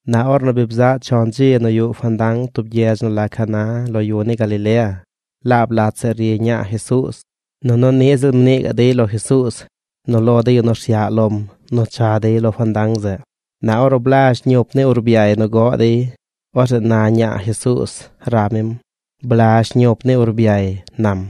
Na ornu bi bzaꞌ chon dzi nu yuꞌ fandang tub gyedz nu la Caná lo yu ni Galilea. Laab lat zeꞌ ri ñaa Jesuuz. Nunu niꞌ ziꞌl mnii gaꞌ dey lo Jesuuz nu lo de yu nu rsyaꞌ lom nu cha dey lo fandang zeꞌ. Na ornu blazh ñup ni urbyay nu goꞌ dey, orzeꞌ na ñaa Jesuuz rab mim: ―Blazh ñup ni urbyay ―nam.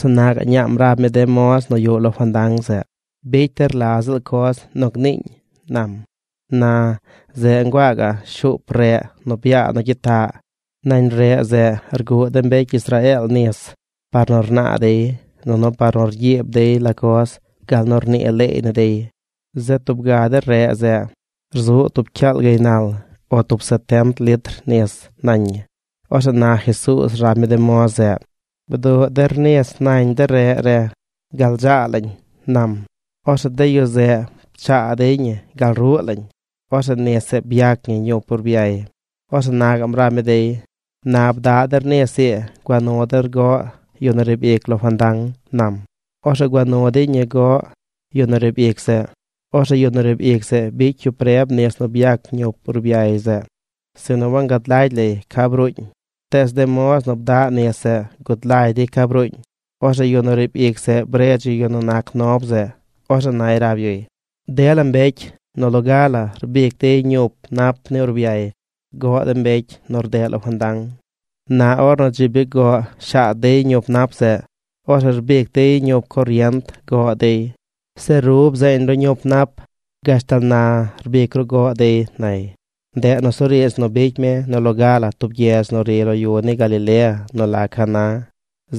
Orzeꞌ na gaꞌ ñaam rab mi de moz nu yuꞌ lo fandang zeꞌ: ―Bicy der la ziꞌl coz nu gniiñ ―nam. Na, zeꞌ nguaa gaꞌ shuup reꞌ nu byaa nu gyitaꞌ. Nañ reꞌ zeꞌ rguꞌ de mbecy Israeel nis par nu rnaa dey nunu par nu rgyiib dey la coz gal nu rnii leey ni dey. Zeꞌ tub ga de reꞌ zeꞌ rzuꞌ tub cyaal gaynal, o tub setent litr nis nañ ñi. Orzeꞌ na Jesuuz rab mi de moz zeꞌ: ―Bduꞌ der nis nañ de reꞌ re gal dzaa lañ ―nam. Orzeꞌ de yu zeꞌ pchaa dey ñi gal ruꞌ lañ. Orzeꞌ nis zeꞌ byac ñi ñup ni urbyay. Orzeꞌ na gaꞌm rab mi dey: ―Na bdaꞌ der nis ii gua nu der goꞌ yu nu riib ic lo fandang ―nam. Orzeꞌ gua nu dey ñi goꞌ yu nu riib ic zeꞌ. Orzeꞌ yu nu riib ic zeꞌ bicy yu preb nis nu byac ñup ni urbyay zeꞌ, sinu wangad lagy lay ca bruuñ. Tees de moz nu bdaꞌ nis zeꞌ gud lagy dey ca bruuñ. Orzeꞌ yu nu riib ic zeꞌ bredz yu yu nu nac nob zeꞌ. Orzeꞌ nay rab yuy: ―Dela mbecy nu loga la rbic dey ñup nap ni urbyay goꞌ de mbecy nu rdeꞌ lo fandang. Na ornu dzi bi goꞌ shaad dey ñup nap zeꞌ, orzeꞌ rbic dey de ñup corient goꞌ dey. Zeꞌ ru bzeeñ ru ñup nap gashtal na rbic ru goꞌ dey ―nay. Ndeꞌ nusuriidz nu bicy mi nu loga la tub gyedz nu ri lo yu ni Galilea nu la Caná.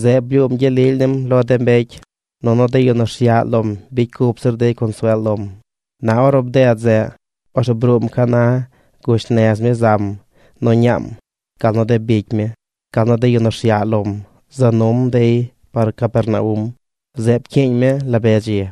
Zeꞌ blyuum gyel lily nim lo de mbecy, nunu de yu nu rsyaꞌ lom bicy cup zir dey consuel lom. Na ornu bded zeꞌ, orzeꞌ bruum Caná gush nez mi zam nu ñaam, gal nu de bicy mi, gal nu de yu nu rsyaꞌ lom za num dey par Capernaum. Zeꞌ pcyiiñ mi la be dzi.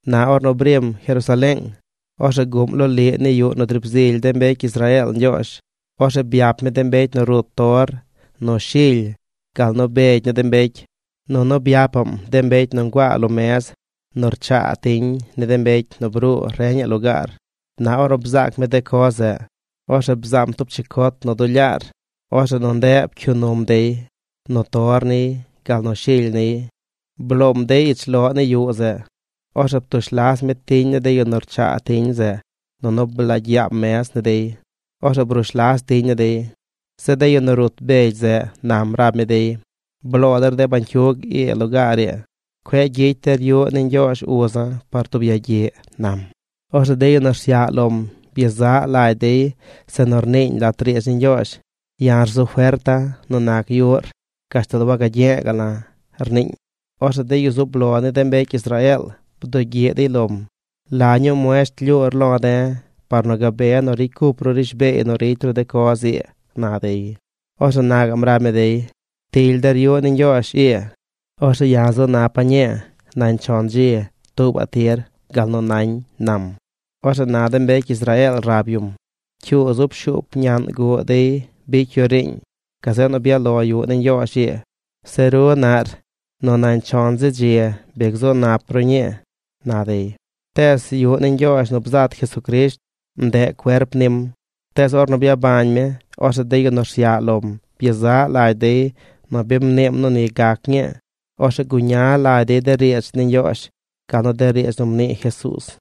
Na ornu brim Jerusaleeng, orzeꞌ guꞌm loliꞌ ni yuꞌ nu driib zily de mbecy Israeel Ñgyoozh. Orzeꞌ byap mi de mbecy nu rut tor, nu shily, gal nu begy ni de mbecy. Nunu byapaꞌm de mbecy nu nguaa lo mez nu rchaa tiñ ni de mbecy nu bruu reñaꞌ lugaar. Na ornu bzaac mi de coz zeꞌ, orzeꞌ bzaam tub chicot nu duu lyaar. Orzeꞌ nu ndeꞌ pcyuu num dey, nu tor niy, gal nu shily niy. Bloom dey ich loꞌ ni yuꞌ zeꞌ. Orzeꞌ ptush las mi tiñ ni de yu nu rchaa tiñ zeꞌ nunu blaagy yaam mez ni dey. Orzeꞌ brush las tiñ ni dey. Zeꞌ de yu nu rut begy zeꞌ nam rab mi dey: ―Bloo der de bañcyug ii lugaar ii. Cueꞌ gyicy der yuꞌ ni Ñgyoozh uza̱ par tub yagyiꞌ ―nam. Orzeꞌ de yu nu rsyaꞌ lom byezaꞌ lagy dey zeꞌ nu rniiñ lat riidz ni Ñgyoozh: “Ya̱ rzu ferta̱ nu nac yuꞌr gashtal wagagye̱e̱ ga̱ꞌ la̱”, rniiñ. Orzeꞌ de yu zub lo ni de mbecy Israeel bdugyiꞌ dey lom: ―¿La ñuu muesht lyuur lo̱ de̱ par nu gabe nu ricy cup ru rishbeey nu ricy ru de coz ii? ―na dey. Orzeꞌ na gaꞌm rab mi dey: ―Ptily der yuꞌ ni Ñgyoozh ii. Orzeꞌ ya̱ zu napa̱ ñii nañ chon dzi tuubaꞌ tir gal nu nañ ―nam. Orzeꞌ na de mbecy Israeel rab yum: ―Cyuu zub shuup ñaꞌn guꞌ dey bicy yu riiñ, gazeꞌ nu byaꞌ lo yuꞌ ni Ñgyoozh ii. Zeꞌ ru naꞌr nu nañ chon zi dzi bi gzu nap ru ñii ―na dey. Tees yuꞌ ni Ñgyoozh nu bzat Jesucrisht, ndeꞌ cuerp nim. Tees ornu byabañ mi, orzeꞌ de yu nu rsyaꞌ lom byezaꞌ lagy dey nu bi mniim nu ni gac ñii. Orzeꞌ guña lagy dey de riidz ni Ñgyoozh gal nu de riidz nu mnii Jesuuz.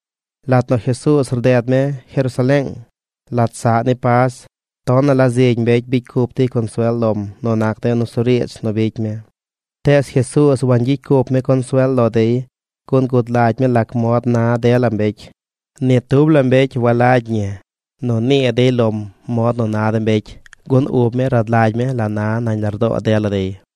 Lat nu Jesuuz rded mi Jerusaleeng, lat saꞌ ni Pas, tonaꞌ la zigy mbecy bicy cup dey consuel lom nu nac de nusuriidz nu bicy mi. Tees Jesuuz wangyicy cup mi consuel lo dey gun gud lagy mi lac mod na dela mbecy. Ni tub la mbecy walagy ñi nu nii dey lom mod nu na de mbecy, gun ub mi rad lagy mi la na nañ lardoo dela dey.